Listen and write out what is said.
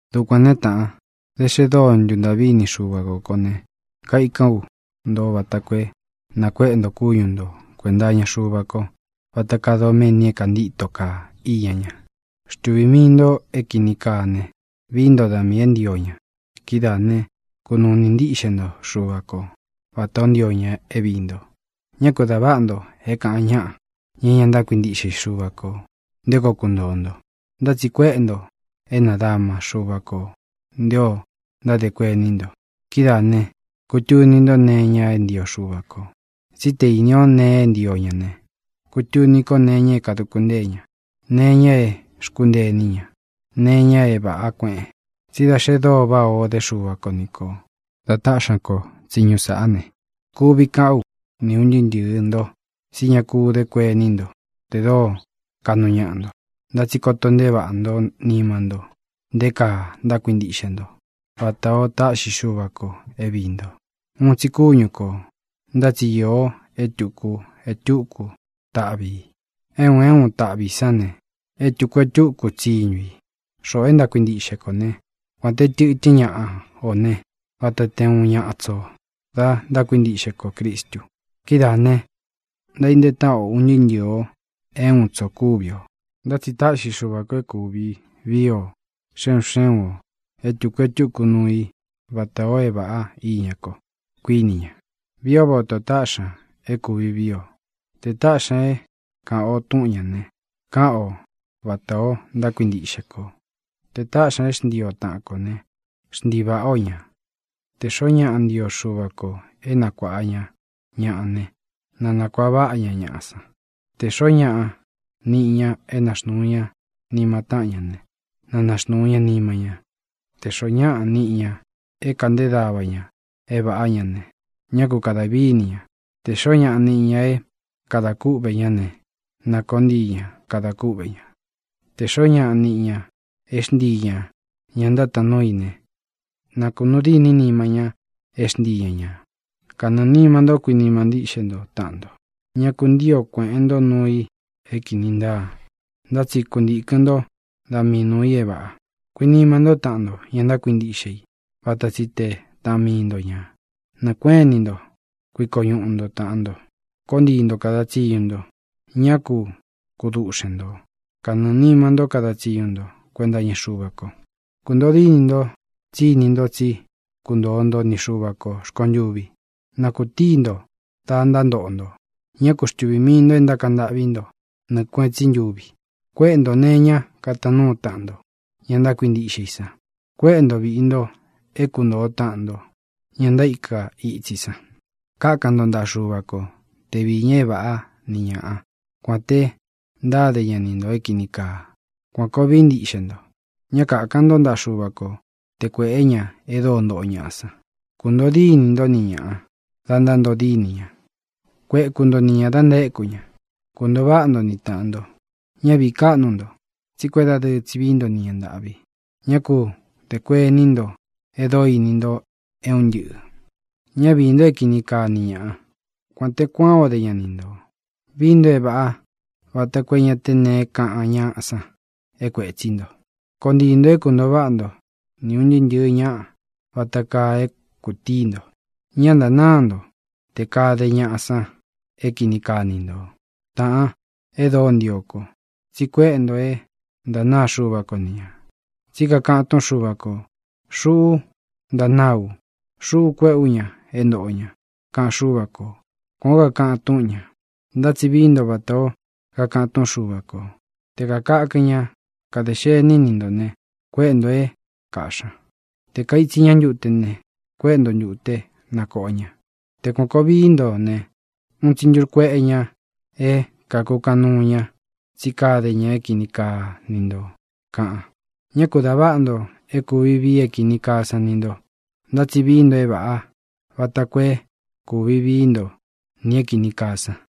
Dukuān né, tāꞌan, da xe dóo ntuntaꞌví ini Xuva ko kō ne, kaikán u nto vata koo é nakuēꞌé nto kúñu nto kuēnta iña Xuva ko vata kaa doméni é kāntíto kaa íña ña. Xtuvī mii nto é kīni kaa ne, vií nto da miī é ntio ña. Kidáā ne, kunuu ini ntíꞌxe nto Xuva ko vatā ó ntio ña é viī nto. Ñá ku dā váꞌa nto é kāꞌan ñáꞌa, ña é ña ntákuintiꞌxe i Xuva kō, nté koo kuntōo nto. Ntá tsi kuéꞌe nto é nadama Xuva kō nté ō ntádē kuení nto. Kidáā ne, kutuni ntó nee iña é ntio Xuva kō. Tsí tē íni o nee é ntio ña ne, kutuni ko nee iña é kāduku ntée ña, nee iña e xkúntee iní ña, nee iña é vāꞌá kueꞌen. Tsí da xe dóo váꞌā o dé Xuva ko nī kó da táꞌxi ñā kó tsiñu sāꞌá ne, kuvi kaꞌán u ni ūn ntɨɨ́ ntɨɨ̄ nto tsí ña ku dé kuení nto te dóo kaꞌnu ñaꞌa nto. Ntá tsi koto nteé vaꞌa nto nima nto nté kaa ntákuintiꞌxe nto vatā o táꞌxi Xuva kō é viī nto. Uun tsi kúñu kō, ntá tsi īó e túku e túku taꞌvi ī. É un é un taꞌvi ī sán ne, é tūku e túku tsiñu i. Xoꞌō e ntákuintiꞌxe kō né, kuān te tɨtɨ́n ñaꞌa ō né, vata te uun ñaꞌa tsō da ntákuintiꞌxe kō Cristu. Kidáā ne, ntaíntee táꞌan o ūun ntɨɨ́ ntɨ̄ɨ o é uun tso kuvi ō. Ntá tsi táꞌxi Xuva kō é kūvi vii o, xé un xé un ō, e túku e túku nuu i vatā ó é vāꞌá iña ko, kuíni ña. Vii ó vata ō táꞌxi ña é kūvi vii o. Tē táꞌxi ña é kāꞌan o túꞌun ñā ne, káꞌan o vatā ó ntákuintiꞌxe kō. Te tāꞌxi ña é xntii o taꞌan kō ne, xntii vāꞌá o ñā. Tē xoó ñaꞌa ntio Xuva kō é nakuāꞌa ña ñaꞌa ne, na nakuāꞌa váꞌa ña ñaꞌa san. Tē xoó ñaꞌa niꞌi ña é naxnūu ña nima táꞌan ña ne, na naxnūu ña nima ña. Tē xoó ñaꞌa niꞌi ña é kāꞌnté dava ña é vāꞌá ña ne, ñá ku kadā víni ñā. Tē xoó ñaꞌa niꞌi ña é kadā kúꞌvē ñá ne, na kōó ntii ña kadā kúꞌvē ña. Tē xoó ñaꞌa niꞌi ña é xntii ñā ña ntátaan núu i ne, na kūnuu díni nima ña é xntii ña ñā. Kanɨɨ̄ nima ntó kuinima ntíꞌxe nto taꞌan nto. Ñá ku ntío kuēꞌen nto nuu i é kīni ntáa, ntá tsi kuntīkɨn ntó da mii nuū i é vāꞌa. Kuinima ntó taꞌan nto, ña ntákuintiꞌxe i, vata tsi te taꞌan mii nto ñā. Nɨɨ̄ kueꞌén ini nto kuiko ñuꞌu nto tāꞌan nto. Koo ntii nto kāda tsiñu nto. Ñá ku kuduꞌxen ntō. Kanɨɨ̄ nima ntó kada tsiñu nto kuenta iña Xuva ko. Kuntōo dínī nto, tsí ini nto tsí kuntoo nto ni Xuva kō rkontuvi. Na kūtií nto da ntántoꞌo nto. Ñá ku xtuvī mii nto e ntákaꞌan ntâꞌví nto nɨɨ kuēꞌen tsí ntuvi. Kuéꞌe ntō nee iñá kataan núu taꞌan nto, ña ntákuintiꞌxe i san. Kuéꞌe nto vīꞌi nto é kuntōo taꞌan nto, ña ntaíka itsi san. Kákan nto ntaꞌa Xuva ko te viī ña é vāꞌá ni ñaꞌa, kuān te ntáde ña ni ntō é kīni kaa. Kuān koo vií ntiꞌxe nto. Ñá kākan ntó ntaꞌa Xuva ko te kuēꞌé ña e dóo ntoꞌo ñāꞌa san. Kuntōo dínī ntó ni ñāꞌa da ntántoo dínī ña. Kueku nto ni ñā da ntaéku ña. Kuntōo váꞌa nto ni tāꞌan nto. Ñá vīí kaꞌnu nto, tsi kuédadɨɨ tsi vií nto ni ña ntāꞌvi. Ñá ku dē kuení nto e dóo ini nto é un ntɨꞌɨ̄. Ñá viī nto é kini kaa ni ñāꞌá, kuān te kuán o de ña ni ntō. Vií nto é vāꞌá vata koo é ña té nee kaꞌan ñáꞌa san é kuētsí nto. Koó ntii ntō é kuntōo váꞌa nto ni ūn ntɨɨ́ ntɨ̄ɨ́ ñaꞌa vata kaa é kūtíi nto. Ñá ntānáa nto tē kade ñaꞌa san é kini kaa ni ntō, taꞌan e dóo ntio kó, tsi kuéꞌe nto é ntānáa Xuva ko ni ñā. Tsí kakaꞌan túꞌun Xuva kō: “Xuꞌú ntanáa u. Xuꞌu kuéꞌe ú ña é ntōꞌo ña”, kaꞌan Xúva kō. Kuān ó kakaꞌan túꞌun ñā. Ntá tsi vií nto vatā ó kakaꞌan túꞌun Xuva kō: “Te kākakɨn ña kade xení ni ntō ne, kuéꞌe ntō é kāꞌxi ña. Tē kaitsi ñá ntute ne, kuéꞌe nto ntute na kōꞌo ña. Te kuan kōo vií nto ne, un tsi nturkueꞌe ña é kākukaꞌan nuu ña tsí kade ña é kini kaa ni ntō”, kaꞌan. Ñá ku dā váꞌa nto é kūvi vii é kīni kaa san ni nto, ntá tsi vií nto é vāꞌá vata koo é kūvi vií nto nī é kīni kaa san.